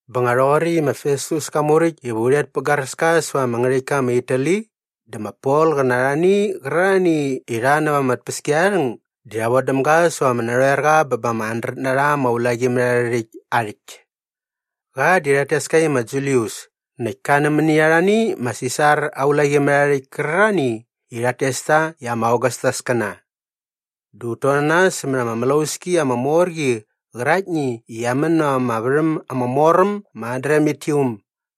Bä nga rhoqoräkt i ma Festus ka muräkt iva u rhet pä garäska säva ama ngärhäktka ma Itali dä ma Pol qä na arhani qärarhani i rha näva ama tpäskiarharhäng di rha vodäm da säva ama narhoerqa bä ba ama handret na rha ama ulaqimärharhärhäkt aa rhäkt. Qa di rhat tes ka i ma Julius näkt ka nämäni arhani ma Sisar aa ulaqimärharhärhäkt kärarhani i rhat tes ta i ama Ogastaskäna. Dä ut ton na nas sämät ama mlauski ama mor qi qäraktni i qia män näva ama värhäm ama mor äm ma Adramitium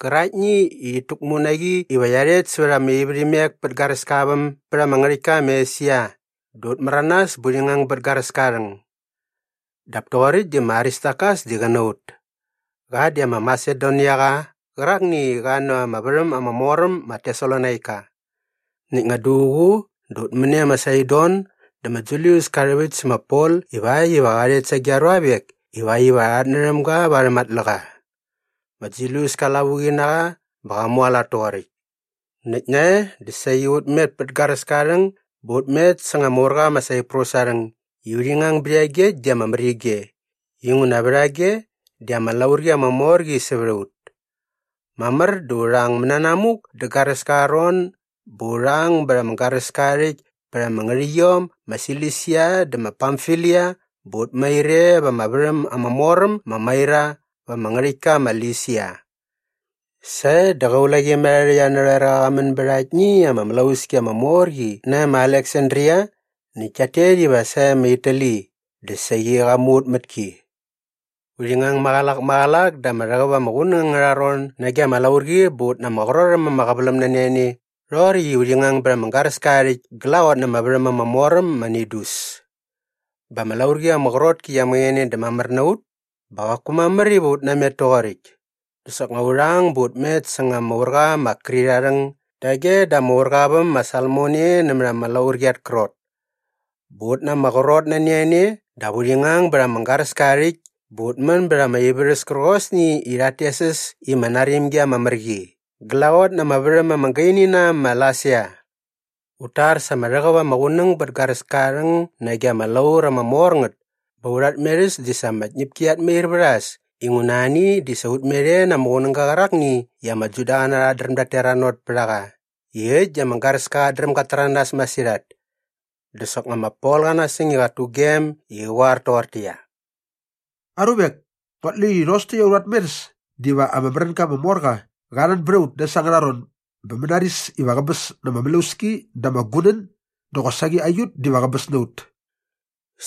gäraktni i rhit täkmu na qi iva qia rhet sävät ama ivärhimek pät garäska aa väm bät ama ngärhäktka ma Esia dä ut märanas bä urhi ngang bät garäska aa rhäng. Dap toqoräkt di ma Aristarkas di qä na ut. Qa di ama Masedoniaqa qärakni i qa näva ama värhäm ama mor äm ma Tesalonaika. Näkt nga duququ dä ut män e ma Saidon dä ma Julius ka rhäväkt sä ma Pol ivakt iva qa rhet sage aa ruavek ivakt iva rha rhatnärhäm ga varhäm aa tläqa. Ma Julius ka lavuqi na qa bä qa mualat toqoräkt. Näkt nae dä saqi ut met pät garäska aa rhäng bä ut met säng ama urqa ma Saiprus aa rhäng i urhi ngang bät iagekt di ama mär ige inguna vä rhage di ama laurqi ama mor qi sävät a ut. Mamär dä urha ang mananamuk dä garäska aa ron bä urha ang bät ama garäska aa rhäkt pät ama ngärhäqyiom ma Silisia dä ma Pamfilia bä ut mair e va ama värhäm ama mor äm ma Maira va ama ngärhäktka ma Lisia. Sae dä qä ulaqimärharhärhäkt arhä narhoerqa qa män bät aktni ama mlauski ama mor qi nae ma Aleksandria näkt kiat tet iva sae ma Itali dä saqi qa mu ut mät ki. Urhi ngang maqälak maqälak da ama rhäqäp ama qunäng angärha ron nage ama laurqi bä ut na ama qrot äm ama qäväläm nani a ne rhoqoräkt i urhi ngang bät ama garäska aa rhäkt glaqot na ama värhäm ama mor äm ma Nidus. Bä ama laurqi ama qrot ki qia mäqäne dä mamär na ut bä qaku mamär iva ut namet toqoräkt dä soknga urha ang bä ut met säng ama urqa ma Krit aa rhäng dage da ama urqa aa väm ma Salmone nämät ama laurqi at krot. Bä ut na ama qrot nani a ne dap urhi ngang bät ama garäska aa rhäkt bä ut män bät ama ivärhäs kärqosni i rhat tes äs i ma Narimgi ama Mär Qi glaqot na ama värhäm ama gaini na äm ma Lasea. Ut tar sa ama rhäqäp ama qunäng bät garäska aa rhäng nage ama laur ama mor ngät bä aurha tmerhäs di sa ama tñäpki qiat mair vät a äs inguna ani di sa ut met e na ama qunäga qärakni i ama Judaqäna rhat dräm dat teranot pät a qa i äkt di ama garäska qat dräm gat täranas masirhat. Dä soknga ma Pol qa nasäng i qat tugem i qä qoar toqortäqyia, “Aruvek, nguat lu i rhos täkt aurha tmerhäs diva anga märänga ama mor qa qa rhän bät a ut dä äs angärha ron bä mänaris iva qäbäs na ama mlauski dä ama gunän dä qosaqi aiut diva qäbäs na ut.”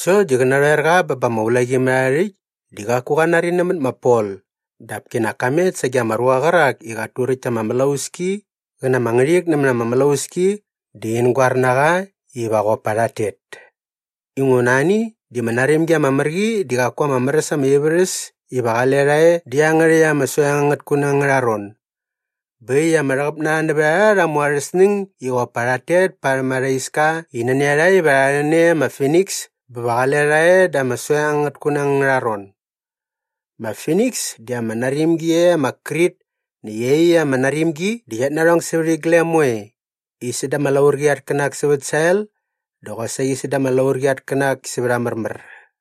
Sokt di qä narhoerqa bä ba ama ulaqimärharhärhäkt di qaku qa nari nämät ma Pol dap kinak ka met sage ama ruqa qärak i qat turäkt ta ama mlauski qä na ama ngärhik nämät ama mlauski dä in goar na qa iva qop pa rhat tet. Inguna ani di ma Narimgi ama Mär qi di qaku ama mär äs ama ivärhäs iva qale rha e dä iangärhäkt ama soeng angät kunäng angärha ron. Bä äkt i ama rhäqäp na rha nävät a rha rha mu arhä snäng i qop pa rhat tet parhäm arha iska i nani a rha iva rha rhän e ma Finiks bä va qale rha e dä ama soeng angät kunäng angärha ron. Ma Finiks di ama narimgi e ma Krit näkt iaqyäkt ama narimqi di qiat narhong sävät iglem moe i säda ama laurqi at känak sävät sael dä qosaqi säda ama laurqi at känak sävät a märmär.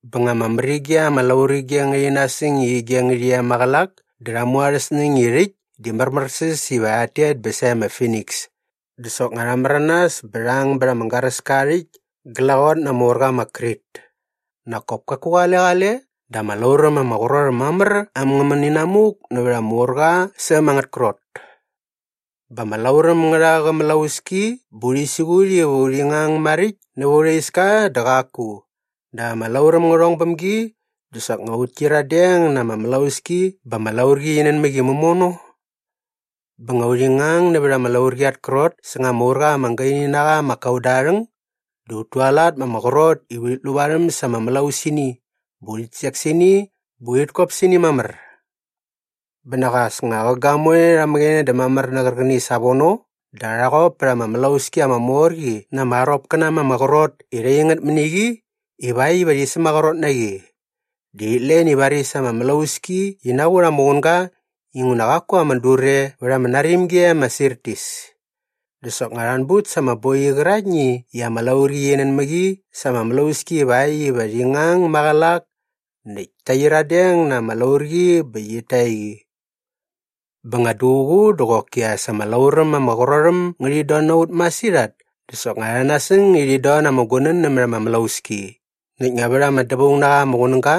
Bä nga ama mär ige ama laurige ngärhi nasäng i ige ngärhi e maqälak dä rha mu arhä snäng i rhäkt di märmärsäs iva rhat tet bä sae ma Finiks dä soknga rha märanas bä rha ang bät ama garäska aa rhäkt glaqot na ama urqa ma Krit. Nak kop kaku qale qale dä ama lauräm ama qrot äm mamär äm ngä män inamuk nävät ama urqa sa äm angät krot. Bä ama lauräm ngä rha qä mlauski bä urhi siqut iva urhi ngang maräkt näva aurha iska dä qaku dap ama lauräm ngä rhong bäm gi dä soknga ut kyiradeng na ama mlauski bä ama laurqi qi nän mä qi mämono. Bä nga urhi ngang nävät ama laurqi at krot säng ama urqa ama gaini na qa ma Kauda aa rhäng dä ut tualat ma ama qrot i urhit lu varhäm sa ama mlausini bä urhit sek sä ini bä urhit kop sä ini mamär. Bä nak as nga qä gamoe rha mäqäne dä mamär nä qärqäni savono dä rha qop pät ama mlauski ama mor qi na ama aropkäna ma ama qrot i rha ing ngät mäni qi ivakt iva rhi sämaqrot na qi. Dä rhit len i varis ama mlauski qi naqut ama qunga inguna qaku ama dur e vät ama narimgi e ma Sirtis. Dä soknga rha anbut sa ama boiqi qäraktni i ama laurqi qi nän mä qi sa ama mlauski ivakt iva qi ngang maqälak näkt ta qyiradeng na ama laurqi bä qit ta qi. Bä nga duququ dä qoki as ama lauräm ama qrot äm ngärhit don na ut masirhat dä soknga rha nasäng i rhit don na ama gunän nämät ama mlauski näkt nga vät ama dävaung na qa ama qunäga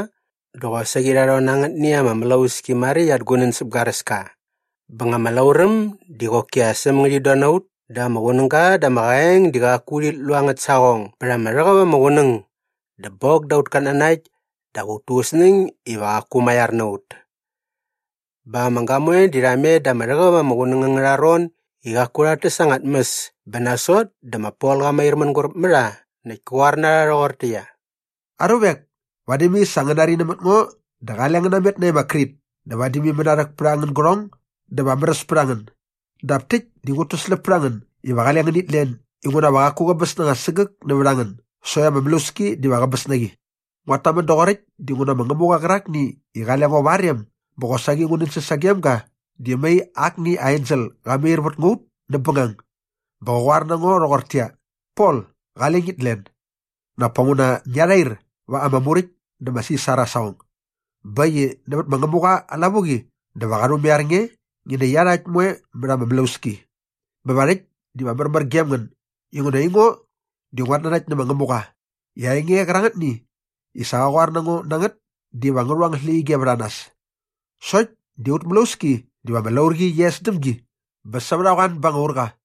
dä qosaqi rha rhon na angätni ama mlauski maräkt at gunän säp garäska. Bä nga ama lauräm di qoki as äm ngärhit don na ut dä ama qunäga dä ama qaeng di qaku urhit lu angät saqong bät ama rhäqäp ama qunäng dä bok da aut katnanakt dap ut tu ut snäng iva qaku maiar na ut. Bä ama gamoe di rha met da ama rhäqäp ama qunäng angärha ron i qaku rhat täs anga tmäs bä nasot dä ma Pol qa mair mänguräp mä rha näkt kä qoar na rha rhoqortäqyia, “Aruvek, vadi mai sa ngäni nari nämät ngo dä qale ngän namet nae ma Krit dä vadi mai mänarhäk pät angän gärhong dä va ama märäs pät a ngän. Dap täkt di ngut täsläp pät a ngän iva qale ngänit len inguna va qaku qäbäs na anga sägäk nävät a ngän sokt ama mlauski diva qäbäs na qi. “Nguat tamän doqoräkt dinguna ma Ngämuqa qärakni i qale ngo va aa rem bä qosaqi ngu nänsäs sagem ga di mai akni aa ensel qa mair vät ngua ut näp bängang bä qä qoar na ngo rhoqortäqyia, ‘Pol, qale ngit len. Nak pa nguna ngia rhair va ama muräkt dä ma Sisar aa saqong. Bä äkt i nävät ma Ngämuqa aa lavuqi dä va qa rhumaiar nge ngi nä iarhakt moekt mät ama mlauski.’ Bä va rhäkt diva märmär gem ngän inguna aingo di nguat nanakt nä ma Ngämuqa i aa enge qärangätni i sa qa qoar na ngo na ngät diva ngä rhu angät släqyige vät a nas. Sokt di aut mlauski diva ama laurqi qi es däm gi bä sävät a qoan ba anga urqa.”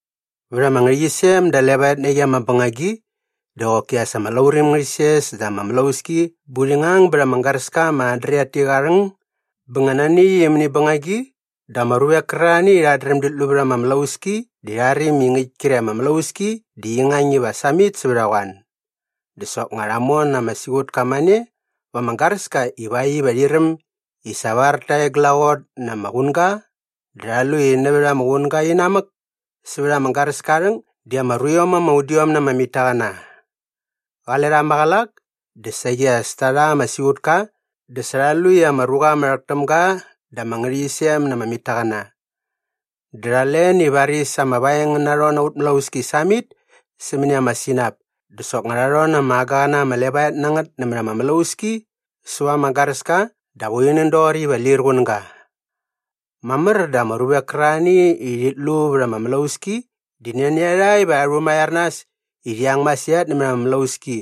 Vät ama ngärhäqyisem da levaet na qi ama bängagi dä qoki as ama lauräm ngärhi ses da ama mlauski bä urhi ngang bät ama garäska ma Adriatik aa rhäng bä nga nani äkt mäni bängagi dä ama ruvek kärarhani i rhat dräm dit lu vät ama mlauski di rha räm i ngäkt kre ama mlauski di qi ngang iva sävät a qoan. Dä soknga rha mon ama siqutka mane va ama garäska ivakt iva rhi räm i sa var ta e glaqot na ama qunga dä rha lu i nävät ama qunga inamäk sävät ama garäska aa rhäng di ama ruiom ama udiom na ama mitaqäna. Qale rha maqälak dä saqi as ta rha ama siqutka dä sa rha lu i ama ruqa ama rhäk täm ga da ama ngärhäqyisem na ama mitaqäna. Dä rha len i varis ama vaeng ngä narhon na aut mlauski samit sämäni ama sinap dä soknga rha rhon na ama agaqäna ama levaet na ngät nämät ama mlauski säva ama garäska dap urhi nän doqoräkt iva lir qunäga. Mamär dä ama ruvek kärarhani i rhit lu vät ama mlauski di nani a rha iva rha rhumaiar nas i rhi ang masirhat nämät ama mlauski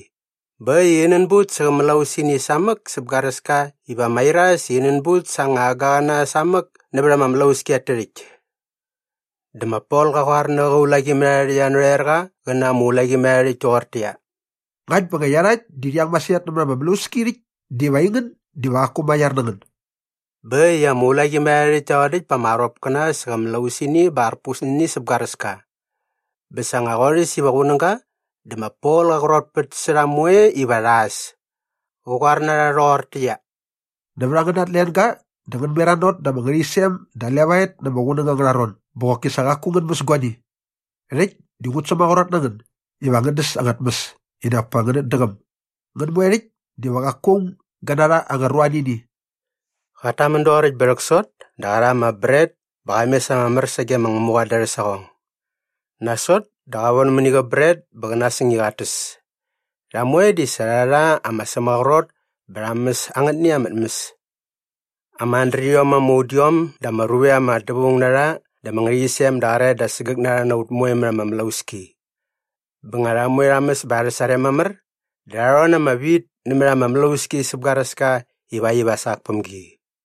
bä äkt i rhi nänbut sä qä mlausini samäk säp garäska iva mairas i rhi nänbut sa anga agaqäna samäk nävät ama mlauski at tärhäkt. Dä ma Pol qa qoar na qä ulaqimärharhärhäkt arhä narhoerqa qä na ama ulaqimärharhärhäkt toqortäqyia, “Ngakt bä nga iarhakt di rhi ang masirhat nämät ama mlauski rhäkt diva aingän diva qaku maiar na ngän.” Bä äkt i ama ulaqimärharhärhäkt ta rhodäkt pa ama aropkäna sä qä mlausini bä arpus nä ini säp garäska. Bä sa nga qorhäs iva qunäga dä ma Pol qa qrotpät sä rha moe iva rha äs. Qä qoar na rha rhoqortäqyia, “Nävät angäna tlenga dä ngän meranot da ama ngärhäqyisem da levaet na ama qunäng angärha ron bä qoki sa qaku ngän mäs guani. Rhäkt di ngut sämaqrot na ngän iva ngän däs anga tmäs i nak pa ngänät däqäm. Ngän moe rhäkt diva qaku aung gä narha anga ruanini.” Qat tamän doqoräkt bä rhäksot dä qa rha ama bret bä qa mes ama mär sage ma Ngämuqa da arhä saqong. Nasot dä qa von mäni qä bret bä qä nasäng i qat täs. Rha moe di sa rha rha ama sämaqrot bä rha mäs angätni ama tmäs. Ama handrediom ama udiom dä ama ruvek ama dävaung na rha da ama ngärhäqyisem da qäraet da sägäk na rha na ut moe mät ama mlauski. Bä nga rha moe rha mäs bä arhä sarem mamär dä rha rhon na ama wit nämät ama mlauski säp garäska ivakt iva sak päm gi.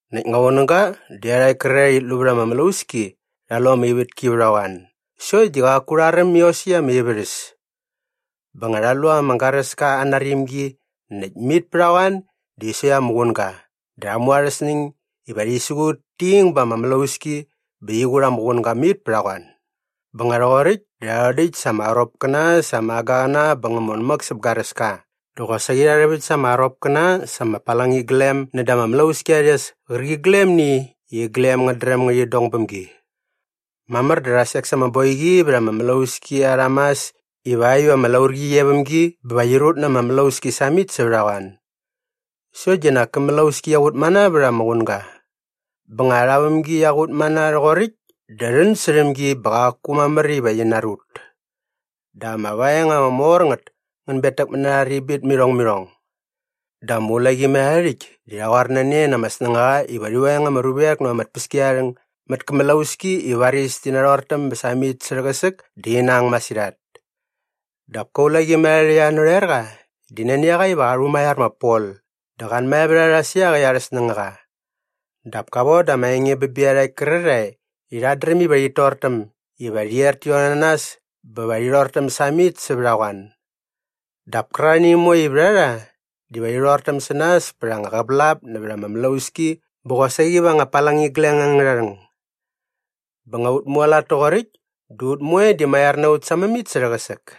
Näkt nga qunäga dä iarhakt kärarhae i rhit lu vät ama mlauski rha lu ama ivätki vät a qoan sokt di qaku rha räm iosäkt ama ivärhäs. Bä nga rha lu ama garäska aa narimgi näkt mit pät a qoan di sokt ama qunga dä rha mu arhä snäng iva rhi siqut ti ing ba ama mlauski bä qi qut ama qunga mit pät a qoan. Bä nga rhoqoräkt dä rha rhodäkt sa ama aropkäna sa ama agaqäna bä ngä mon mäk säp garäska dä qosaqi rha rhäväkt sa ama aropkäna sa ama palangiglem näda ama mlauski arha rhes kärqiglemni i iglem ngät dräm ngärhit dong bäm gi. Mamär dä rha sek sa ama boiqi vät ama mlauski arha mas ivakt iva ama laurqi qi e väm gi bä va qi rut na ama mlauski samit sävät a qoan. Sokt di nak kä mlauski qia qut mana vät ama qunga. Bä nga arha vämgi qia qut mana rhoqoräkt dä rhän särhäm gi bä qaku mamär iva qi narut. Dap ama vaeng ama mor ngät ngän betäkmät na arha ribit mä irhong mä irhong. Dä ama ulaqimärharhärhäkt di rha qoar na ne na ama snängaqa iva rhi veng ama ruvek näva ama tpäskiarharhäng mät kä mlauski i varis ti narhortäm bä samit sä rhäqäsäk dä rhi nang masirhat. Dap kä ulaqimärharhärhäkt arhä narhoerqa di nani a qa iva qa rhumaiar ma Pol dä qa anmae vät a rha sä iaqäkt arhä snängaqa. Dap ka voda ama enge bä bä iarhakt kärarhae i rhat dräm iva rhit tortäm iva rhi er ti rhon na nas bä va rhi rhortäm samit sävät a qoan. Dap kärarhani moe i vät a rha diva rhi rhortäm sä nas pät anga qävälap nävät ama mlauski bä qosaqi va anga palangigleng angärha rhäng. Bä nga ut mualat toqoräkt dä ut moe di maiar na ut sa mämit sä rhäqäsäk.